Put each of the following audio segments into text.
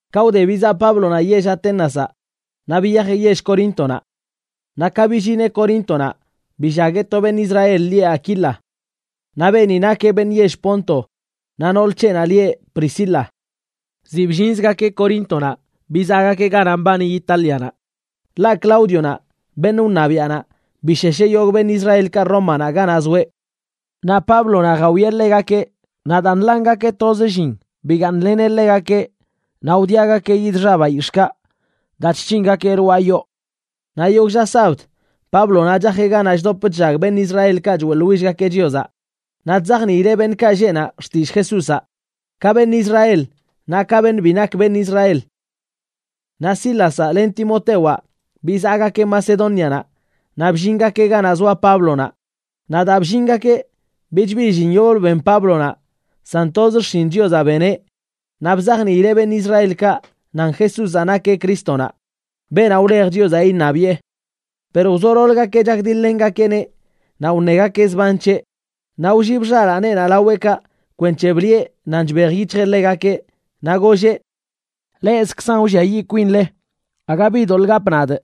Ka wde bizaꞌ Páblonaꞌ yell Aténazaꞌ, naꞌ biyajeꞌ yell Coríntonaꞌ. Naꞌ ka billineꞌ Coríntonaꞌ billagueꞌ to beṉꞌ Israel lieꞌ Aquila. Naꞌ beeni nakeꞌ beṉꞌ yell Ponto naꞌ nool c̱heꞌnaꞌ lieꞌ Priscila. Ziꞌ bllinzgakeꞌ Coríntonaꞌ bizaꞌgakeꞌ ganaꞌ mbani Itálianaꞌ, ḻaꞌ Claudionaꞌ, beṉꞌ wṉabiaꞌnaꞌ, bishesheꞌ yogꞌ beṉꞌ Israelkaꞌ Rómanaꞌ ganaꞌ zoeꞌ. Naꞌ Páblonaꞌ jawieꞌ ḻegakeꞌ, naꞌ daa nḻangakeꞌ toz ka llin, bigaaṉleneꞌ ḻegakeꞌ, naꞌ wdiagakeꞌ yid xa bayix̱ꞌkaꞌ daa chc̱hingakeꞌ lwaa yoo. Naꞌ yogꞌ lla sabd, Páblonaꞌ chajeꞌ ganaꞌ chdop chllag beṉꞌ Israelkaꞌ choeꞌḻwillgakeꞌ Chiozaꞌ, naꞌ chzajniileꞌ beṉꞌkaꞌ lleꞌ naꞌ xtillꞌ Jesúzaꞌ, ka beṉꞌ Israel naꞌ ka beṉꞌ bi nak beṉꞌ Israel. Naꞌ Sílazaꞌ len Timotewaꞌ bizaꞌgakeꞌ Macedónianaꞌ naꞌ bllingakeꞌ ganaꞌ zoa Páblonaꞌ. Naꞌ daa bllingakeꞌ, bich bi llin yoblə ben Páblonaꞌ, san toz xshin Chiozaꞌ beneꞌ naꞌ bzajniileꞌ beṉꞌ Israelkaꞌ nan Jesúzaꞌ nakeꞌ Crístonaꞌ, beenaꞌ wlej Chiozaꞌ iṉabiꞌe. Per wzololəgakeꞌ chakdiḻ-lengakeꞌneꞌ naꞌ wṉegakeꞌ zban c̱heꞌ, naꞌ wllib xalaaneꞌnaꞌ laweꞌkaꞌ kwenc̱he bliꞌe nan chbejyic̱hjeꞌ ḻegakeꞌ, naꞌ golleꞌ: ―Leꞌzkzan wlliayiꞌ kwinle. Aga bi doḻꞌ gapꞌ nadꞌ.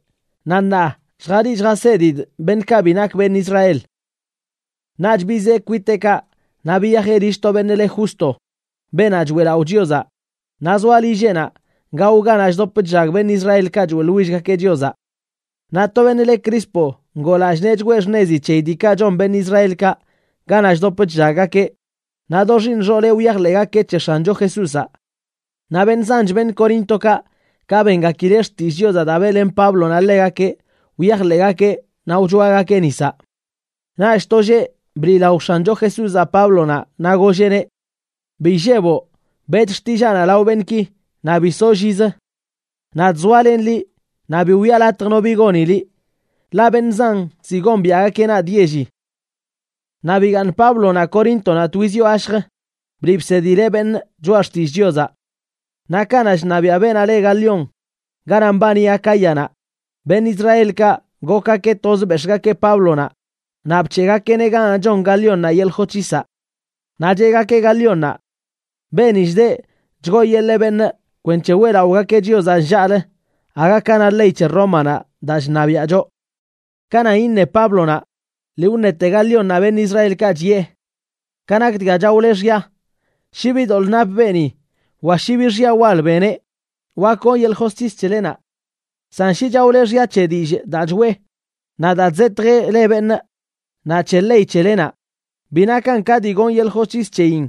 Naꞌ ṉaa lljaliꞌ lljasedidꞌ beṉꞌkaꞌ bi nak beṉꞌ Israel. Naꞌch bizee kwiteꞌkaꞌ naꞌ biyajeꞌ lill to beṉꞌ le Justo, beenaꞌ choeꞌlaꞌo Chiozaꞌ, naꞌ zoa lilleꞌnaꞌ gao ganaꞌ chdop chllag beṉꞌ Israelkaꞌ choeꞌḻwillgakeꞌ Chiozaꞌ. Naꞌ to beṉꞌ le Crispo ngoo lallꞌ nee chgwee xṉezi c̱heyi diikaꞌ chon beṉꞌ Israelkaꞌ ganaꞌ chdop chllaggakeꞌ, naꞌ do xiiṉ xooleꞌ wyajḻeꞌgakeꞌ c̱he X̱ancho Jesúzaꞌ. Naꞌ beṉꞌ zanch beṉꞌ Coríntokaꞌ, ka bengakileꞌ xtillꞌ Chiozaꞌ daa beꞌlen Páblonaꞌ ḻegakeꞌ, wyajḻeꞌgakeꞌ naꞌ wchoagakeꞌ nisaꞌ. Naꞌch to lleꞌ bliꞌlao X̱ancho Jesúzaꞌ Páblonaꞌ, naꞌ golleꞌneꞌ: ―Bi illeboꞌ. Beꞌch xtillaanaꞌ lao beṉꞌki naꞌ bi soꞌ llizə. Nadꞌ zoalenꞌ liꞌ, naꞌ bi wiꞌa latj no bi goni liꞌ, ḻaꞌ beṉꞌ zan ziꞌ gombiaꞌgakeꞌ nadꞌ yelli. Naꞌ bigaaṉ Páblonaꞌ Coríntonaꞌ twiz yoo gashj bliꞌ bsedileꞌ beṉꞌ choꞌa xtillꞌ Chiozaꞌ. Naꞌ kanaꞌ chṉabiaꞌ beenaꞌ le Galión ganaꞌ mbani Acáyanaꞌ, beṉꞌ Israelkaꞌ gokgakeꞌ toz bex̱ꞌgakeꞌ Páblonaꞌ naꞌ bc̱heꞌgakeꞌneꞌ ganaꞌ chon Galiónnaꞌ yeḻꞌ josc̱hisaꞌ. Naꞌ cheꞌgakeꞌ Galiónnaꞌ: ―Beeni chdeꞌ chgooyeḻee beṉꞌ kwenc̱he weꞌlaꞌogakeꞌ Chiozaꞌ nllaꞌlə aga ka na ley c̱he Rómanaꞌ daa chṉabiaꞌ choꞌ. Ka nan iṉe Páblonaꞌ, lii wṉete Galiónnaꞌ beṉꞌ Israelkaꞌ, chiꞌe: ―Ka nak dga chaole xya, shi bi doḻꞌ nap beeni wa shi bi xya wal beneꞌ, wak gonꞌ yeḻꞌ josc̱his c̱helenaꞌ. San shi chaole xya c̱he dillꞌ daa choꞌe, naꞌ daa chzetjeꞌ le beṉꞌ, naꞌ c̱he ley c̱helenaꞌ, bi nakan ka dii gonꞌ yeḻꞌ josc̱his c̱heyin.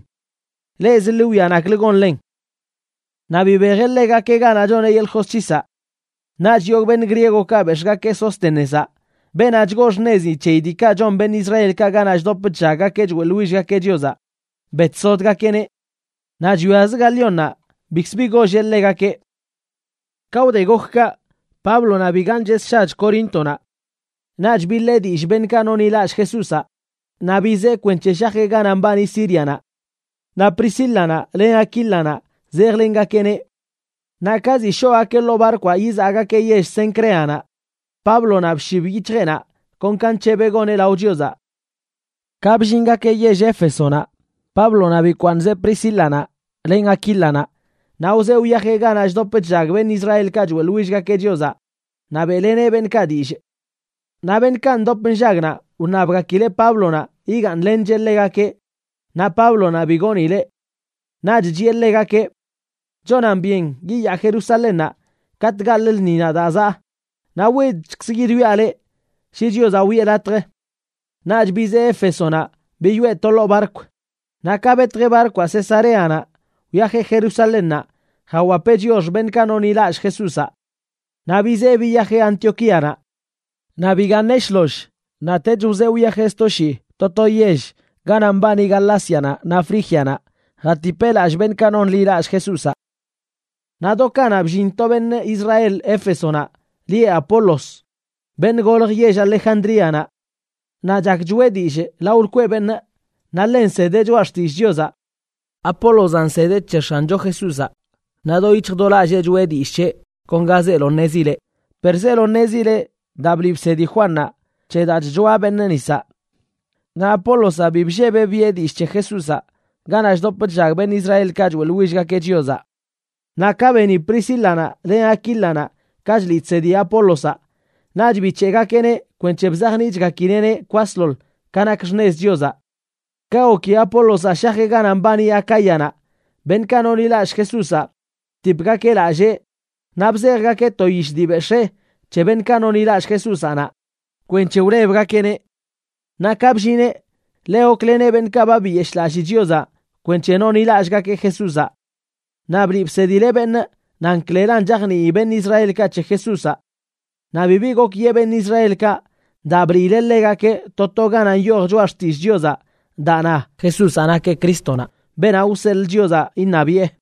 Leꞌzə, ḻi wwia naklə gonlen. Naꞌ bibejeꞌ ḻegakeꞌ ganaꞌ choneꞌ yeḻꞌ josc̱hisaꞌ. Naꞌch yogꞌ beṉꞌ griegokaꞌ bex̱ꞌgakeꞌ Sóstenezaꞌ, beenaꞌ chgoo xṉezin c̱heyi diikaꞌ chon beṉꞌ Israelkaꞌ ganaꞌ chdop chllaggakeꞌ choeꞌḻwillgakeꞌ Chiozaꞌ, betsodgakeꞌneꞌ. Naꞌ chwiazə Galiónnaꞌ bikzə bi golleꞌ ḻegakeꞌ. Ka wde gok kaꞌ, Páblonaꞌ bigaaṉcheꞌ sshach Coríntonaꞌ. Naꞌch biḻee dillꞌ beṉꞌkaꞌ nonḻilallꞌ Jesúzaꞌ naꞌ bizee kwenc̱he shajeꞌ ganaꞌ mbani Sírianaꞌ. Naꞌ Priscílanaꞌ len Aquílanaꞌ zejlengakeꞌneꞌ. Naꞌ ka ziꞌ shoꞌgakeꞌ ḻoo barkwaꞌ yizaꞌgakeꞌ yell Cencreanaꞌ, Páblonaꞌ bshib yic̱hjeꞌnaꞌ kon ka nc̱hebeꞌ goneꞌ lao Chiozaꞌ. Ka bllingakeꞌ yell Éfesonaꞌ, Páblonaꞌ bikwaaṉzeꞌ Priscílanaꞌ len Aquílanaꞌ, naꞌ wzee wyajeꞌ ganaꞌ chdop chllag beṉꞌ Israelkaꞌ choeꞌḻwillgakeꞌ Chiozaꞌ naꞌ beꞌleneꞌ beṉꞌkaꞌ dillꞌ. Naꞌ beṉꞌkaꞌ ndop nllag naꞌ, wṉabgakileꞌ Páblonaꞌ yigaaṉlencheꞌ ḻegakeꞌ, naꞌ Páblonaꞌ bi goonileꞌ. Naꞌch chiꞌe ḻegakeꞌ: ―Chonan byen yiyaa Jerusalénnaꞌ katꞌ gaḻꞌ lṉinaꞌ daa zaꞌ, naꞌ widchkzꞌ yidwiaꞌ leꞌ shi Chiozaꞌ wiꞌe latj. Naꞌch bizee Éfesonaꞌ biyoꞌe to ḻoo barkw. Naꞌ ka betjeꞌ barkwaꞌ Cesareanaꞌ, wyajeꞌ Jerusalénnaꞌ jawapeꞌ chiox beṉꞌkaꞌ nonḻilallꞌ Jesúzaꞌ. Naꞌ bizee biyajeꞌ Antioquíanaꞌ. Naꞌ bigaaṉeꞌ shloll, naꞌtech wzee wyajeꞌ sto shii to to yell ganaꞌ mbani Galácianaꞌ naꞌ Frígianaꞌ jatipcheꞌ lallꞌ beṉꞌkaꞌ nonḻilall Jesúzaꞌ. Naꞌ do kanaꞌ bllin to beṉꞌ Israel Éfesonaꞌ lieꞌ Apolos, beṉꞌ golj yell Alejandríanaꞌ. Naꞌ chak choꞌe dillꞌ lao lkweꞌ beṉꞌ, naꞌ ḻe nsedeꞌ Choꞌa Xtillꞌ Chiozaꞌ. Apólozaꞌ nsedeꞌ c̱he X̱ancho Jesúzaꞌ, naꞌ do yic̱hj do lallee choꞌe dillꞌ c̱heꞌ kon ga zeelo ṉezileꞌ, per zeelo ṉezileꞌ daa bliꞌ bsedi Juannaꞌ c̱he daa chchoa beṉꞌ nisaꞌ. Naꞌ Apólozaꞌ bi bllebeꞌ biꞌe dillꞌ c̱he Jesúzaꞌ ganaꞌ chdop chllag beṉꞌ Israelkaꞌ choeꞌḻwillgakeꞌ Chiozaꞌ. Naꞌ ka beni Priscílanaꞌ len Aquílanaꞌ ka chliꞌ chsedi Apólozaꞌ, naꞌch bic̱heꞌgakeꞌneꞌ kwenc̱he bzajniꞌchgakileꞌneꞌ kwasḻoḻ ka nak xṉez Chiozaꞌ. Ka goki Apólozaꞌ shajeꞌ ganaꞌ mbani Acáyanaꞌ, beṉꞌkaꞌ nonḻilallꞌ Jesúzaꞌ btipgakeꞌ lallee naꞌ bzejgakeꞌ to yish dii bex̱ee c̱he beṉꞌkaꞌ nonḻilallꞌ Jesúzaꞌ naꞌ, kwenc̱he wlebgakeꞌneꞌ. Naꞌ ka bllineꞌ, ḻe gokleneꞌ beṉꞌkaꞌ ba biyeshꞌlallii Chiozaꞌ kwenc̱he nonḻilallꞌgakeꞌ Jesúzaꞌ. Naꞌ bliꞌ bsedileꞌ beṉꞌ nan klelan chajnii beṉꞌ Israelkaꞌ c̱he Jesúzaꞌ. Naꞌ bibi gok yee beṉꞌ Israelkaꞌ daa bliileꞌ ḻegakeꞌ to to ganaꞌ nyoj Choꞌa Xtillꞌ Chiozaꞌ daa na Jesúzaꞌ nakeꞌ Crístonaꞌ, beenaꞌ wseḻꞌ Chiozaꞌ iṉabiꞌe.